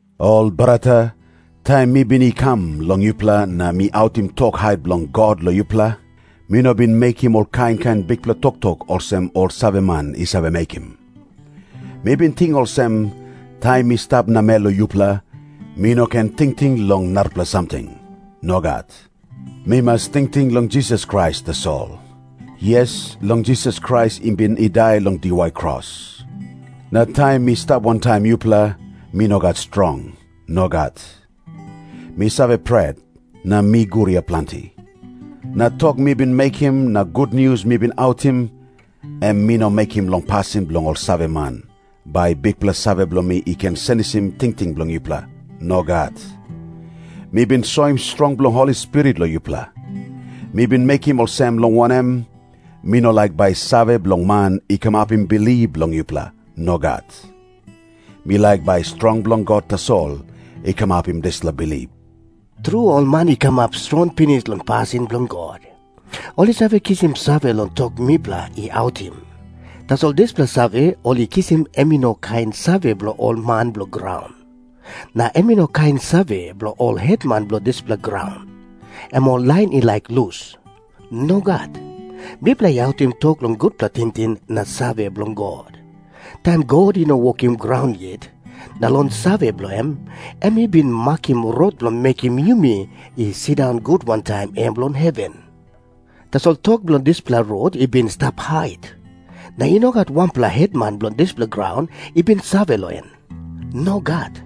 Ol brata, taim mi bin i kam long yupela na mi autim tok hait bilong God long yupela, mi no bin mekim ol kain kain bikpela toktok olsem ol saveman i save mekim. Mi bin ting olsem, taim mi stap namel long yupela, mi no ken tingting long narapela samting. Nogat. Mi mas tingting long Jisas Krais tasol. Yes, long Jisas Krais i bin i dai long diwai kros. Na taim mi stap wantaim yupela, mi no gat strong. Nogat. Mi save pret, na mi guria planti. Na tok mi bin mekim na gutnius mi bin autim, em mi no mekim long pasin bilong ol saveman, bai bikpela save bilong mi i ken senisim tingting bilong yupela. Nogat. Mi bin soim strong bilong Holi Spirit long yupela. Mi bin mekim olsem, long wanem, mi no laik bai save bilong man i kamapim bilip bilong yupela. Nogat. Mi laik bai strong bilong God tasol i kamapim dispela bilip. Tru, ol man i kamap strongpela pinis long pasin bilong God, ol i save kisim save long tok mipela i autim. Tasol dispela save ol i kisim em i no kain save bilong ol man bilong graun. Na em i no kain save bilong ol hetman bilong dispela graun, em ol lain i laik lus. Nogat. Mipela i autim tok long gutpela tingting na save bilong God. Taim God i no wokim graun yet, na long save bilong em, em i bin makim rot bilong mekim yumi i sindaun gut wantaim em long heven. Tasol tok bilong dispela rot i bin i stap hait, na i no gat wanpela hetman bilong dispela graun i bin save long en. Nogat.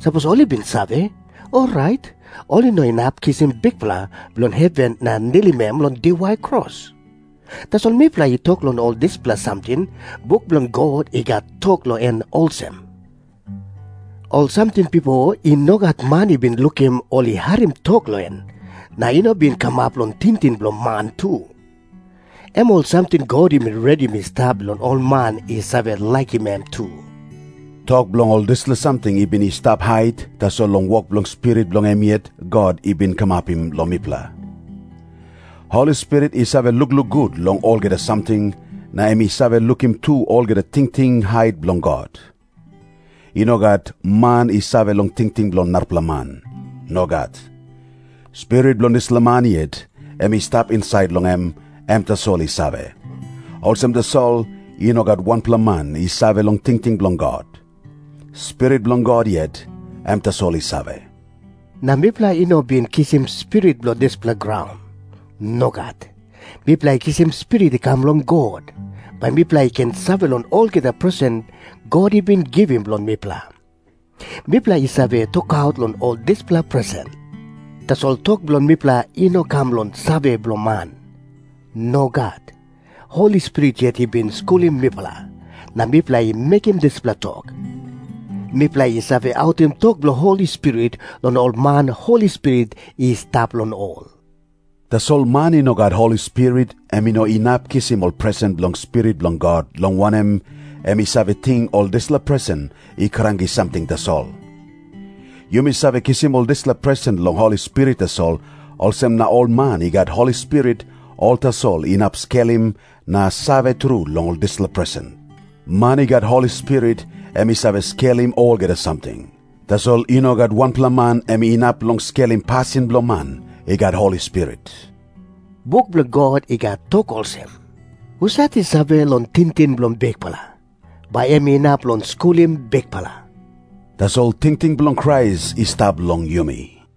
Sapos ol i bin save, orait ol i no inap kisim Bikpela bilong heven na nilim em long diwai kros. Tasol mipela i tok long ol dispela samting buk bilong God i gat tok long en olsem, "ol samting bipo i no gat man i bin lukim o harim tok long en, na i no bin kamap long tingting bilong man tu, em ol samting God i bin redim i stap bilong ol man i save laikim em tru." Tok bilong ol dispela samting i bin i stap hait, tasol long wok bilong Spirit bilong em yet, God i bin kamapim long mipela. Holi Spirit i save lukluk gut long olgeta samting, na em i save lukim tu olgeta tingting hait bilong God. I no gat man i save long tingting bilong narapela man. Nogat. Spirit bilong dispela man yet, em i stap insait long em, em tasol i save. Olsem tasol, i no gat wanpela man i save long tingting bilong God. Spirit bilong God yet, em tasol i save. Na mipela i no bin kisim spirit bilong dispela graun. Nogat. Mipela i kisim Spirit i kam long God, bai mipela i ken save long olgeta presen God i bin givim long mipela. Mipela i save tokaut long ol dispela presen. Tasol tok bilong mipela i no kam long save bilong man. Nogat. Holi Spirit yet i bin skulim mipela, na mipela i mekim dispela tok. Mipela i save autim tok bilong Holi Spirit long ol man Holi Spirit i stap long ol. Tasol man i no gat Holi Spirit, em i no inap kisim ol presen bilong Spirit bilong God, long wanem, em i save ting ol dispela presen i kranki samting tasol. Yumi save kisim ol dispela presen long Holi Spirit tasol, olsem na ol man i gat Holi Spirit, ol tasol inap skelim na save tru long ol dispela presen. Man i gat Holi Spirit, em i save skelim olgeta samting. Tasol i no gat wanpela man em inap long skelim pasin bilong man i gat Holi Spirit. Buk bilong God i gat tok olsem, "Husat i save long tingting bilong Bikpela, bai em inap long skulim Bikpela?" Tasol tingting bilong Krais i stap long yumi.